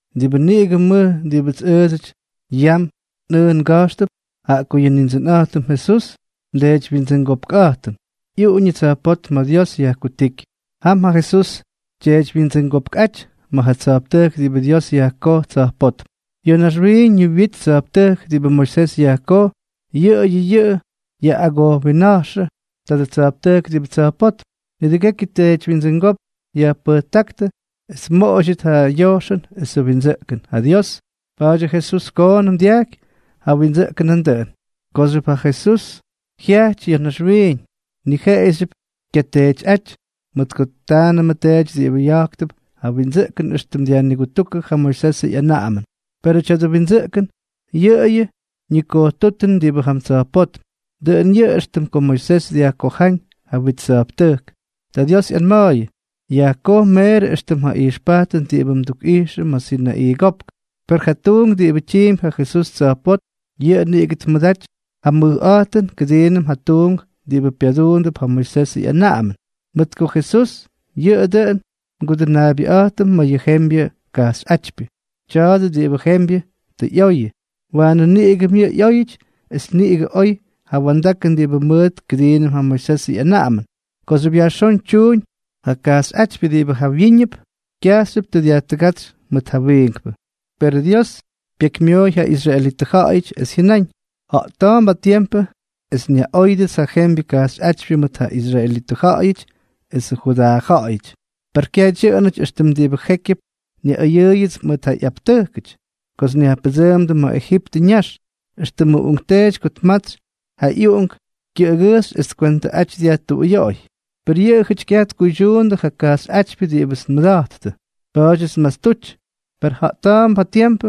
Diꞌibʉ niꞌigʉ mʉj diꞌibʉts ʉʉdsʉty yam nꞌʉʉ nga̱jxtʉp, jaꞌa ko yʉ Nindsʉnꞌa̱jtʉm Jesús, ndeedywyindsʉngopkꞌa̱jtʉm, ꞌyuꞌuñʉ tsa̱jpótm ma̱ Dios yajkutíky. Jam ja Jesús tyeedywyindsʉngopkꞌáty ma̱ ja tsa̱jptʉjk diꞌibʉ Dios yajkoj tsa̱jpótm. Ya̱ naxwiiñ yʉ wit tsa̱jptʉjk diꞌibʉ Moisés yajkoj, yʉꞌʉyʉ yʉꞌʉ yaꞌꞌagojwinna̱jxʉ tadʉ tsa̱jptʉjk diꞌibʉ tsa̱jpótm. Nidʉgekyʉ teedywyindsʉngópk yajpʉjtáktʉ es tmoꞌoydyʉt ja yojxʉn esʉ windsʉꞌkʉn ja Dios, pa̱a̱dyʉ Jesús koonʉm dyaky ja windsʉꞌkʉn nandʉꞌʉn. Kooxyʉp ja Jesús jyaaty ya̱ naxwiiñ, ni jeꞌeyʉxyʉp kyateetyꞌáty, mʉt ko taanʉmʉ teedyʉty diꞌibʉ ya̱jktʉp ja windsʉꞌkʉn éxtʉm dyajnigutúkʉ ja Moisesʉ ꞌyanaꞌamʉn. Perʉ tya̱dʉ windsʉꞌkʉn, yʉꞌʉyʉ ñikojtútʉn diꞌibʉ jam tsa̱jpótm; dʉꞌʉn yʉꞌʉ éxtʉm ko Moisés dyajkojáñ ja wit tsa̱jptʉjk, ta Dios ꞌyanma̱a̱yʉ: “Yajkoj meerʉ éxtʉm ja ijxpajtʉn diꞌibʉ ndukꞌijx ma̱ Sinaꞌii Kopk.” Per ja tuunk diꞌibʉ tyiimpy ja Jesús tsa̱jpótm, yʉꞌʉ niꞌigʉ tmʉdaty ja mʉjꞌa̱jtʉn kʉdiinʉm ja tuunk diꞌibʉ pyaduundʉp ja Moisesʉ ꞌyanaꞌamʉn, mʉt ko Jesús yʉꞌʉ dʉꞌʉn nGudʉnaabyʉꞌa̱jtʉm ma̱ yʉ jembyʉ kajxyꞌátypyʉ. Tya̱a̱dʉ diꞌibʉ jembyʉ tʉ ꞌyoyʉ, waanʉ niꞌigʉm yʉꞌʉ ꞌyóyʉty es niꞌigʉ oy ja wa̱ndakʉn diꞌibʉ mʉʉt kʉdiinʉm ja Moisesʉ ꞌyanaꞌamʉn. Kooxyʉp yajxón tyuuñ ja kajxyꞌátypyʉ diꞌibʉ jawyíñʉp, kyajxyʉp tʉ dyajtʉgátsy mʉt ja wiinkpʉ. Perʉ Dios pyekymyooy ja israelitʉ ja̱ꞌa̱yʉty, es jyʉnáñ: Ja̱ꞌta̱a̱mp ja tiempʉ es nyaꞌóyʉdʉts ja jembyʉ kajxyꞌátypyʉ mʉt ja israelitʉ ja̱ꞌa̱yʉty esʉ Judaa ja̱ꞌa̱yʉty. Per kyaj dyʉꞌʉnʉty éxtʉm diꞌibʉ jékyʉp nyaꞌʉyʉʉyʉts mʉt ja ꞌyaptʉjkʉty kots nyajpʉdsʉʉmdʉ ma̱ Ejiptʉ ñax, éxtʉmʉ uꞌunkteety ko tmatsy ja ꞌyuꞌunk kyʉꞌʉgʉjxy es tkwentʉꞌaty dyajtuꞌuyoꞌoy; per yʉꞌʉjʉty kyaj tkuydyuundʉ ja kajxyꞌátypyʉ diꞌibʉts nmʉda̱jttʉ, pa̱a̱dyʉts nmastuty. Per ja̱ꞌta̱a̱mp ja tiempʉ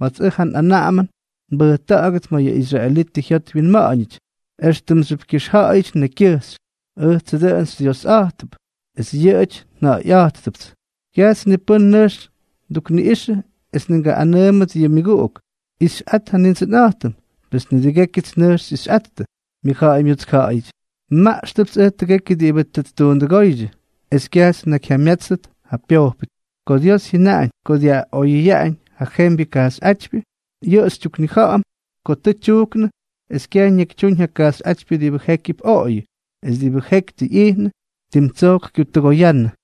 ma̱ts ʉj ja nꞌanaꞌamʉn nbʉjta̱ꞌa̱gʉt ma̱ yʉ israelitʉ jyot wyinma̱ꞌa̱ñʉty, éxtʉmxyʉp kyʉxja̱ꞌa̱yʉty nekykyʉjxy. Ʉjtsʉ dʉꞌʉn xyDyiosꞌátʉp, es yʉꞌʉjʉty nja̱ꞌa̱yꞌátʉpts. Kyaj ni pʉ́n nʉjx ttukniꞌꞌixʉ es ni tkaꞌꞌanʉʉmʉt yʉ myʉguꞌuk: “Ixyꞌat ja Nindsʉnꞌa̱jtʉm”, pes nidʉgékyʉts nʉjx xyꞌixyꞌattʉ, myʉjja̱ꞌa̱y myutskja̱ꞌa̱yʉty. Nmaꞌxʉpts ʉj tʉgekyʉ diꞌibʉ tʉ ttuundʉgóydyʉ, es kyajts nnakyjyamyátsʉt ja pyojpʉty. Ko Dios jyʉnaꞌañ ko dyaꞌoyʉyaꞌañ ja jembyʉ kajxyꞌátypyʉ, yʉꞌʉ xytyuknija̱ꞌa̱m ko tʉ tyujknʉ es kyaj ñakytyúñ ja kajxyꞌátypyʉ diꞌibʉ jékyʉp oꞌoyʉ; es diꞌibʉ jeky tʉ ꞌyijnʉ, tim tsojk kyutʉgoyánnʉ.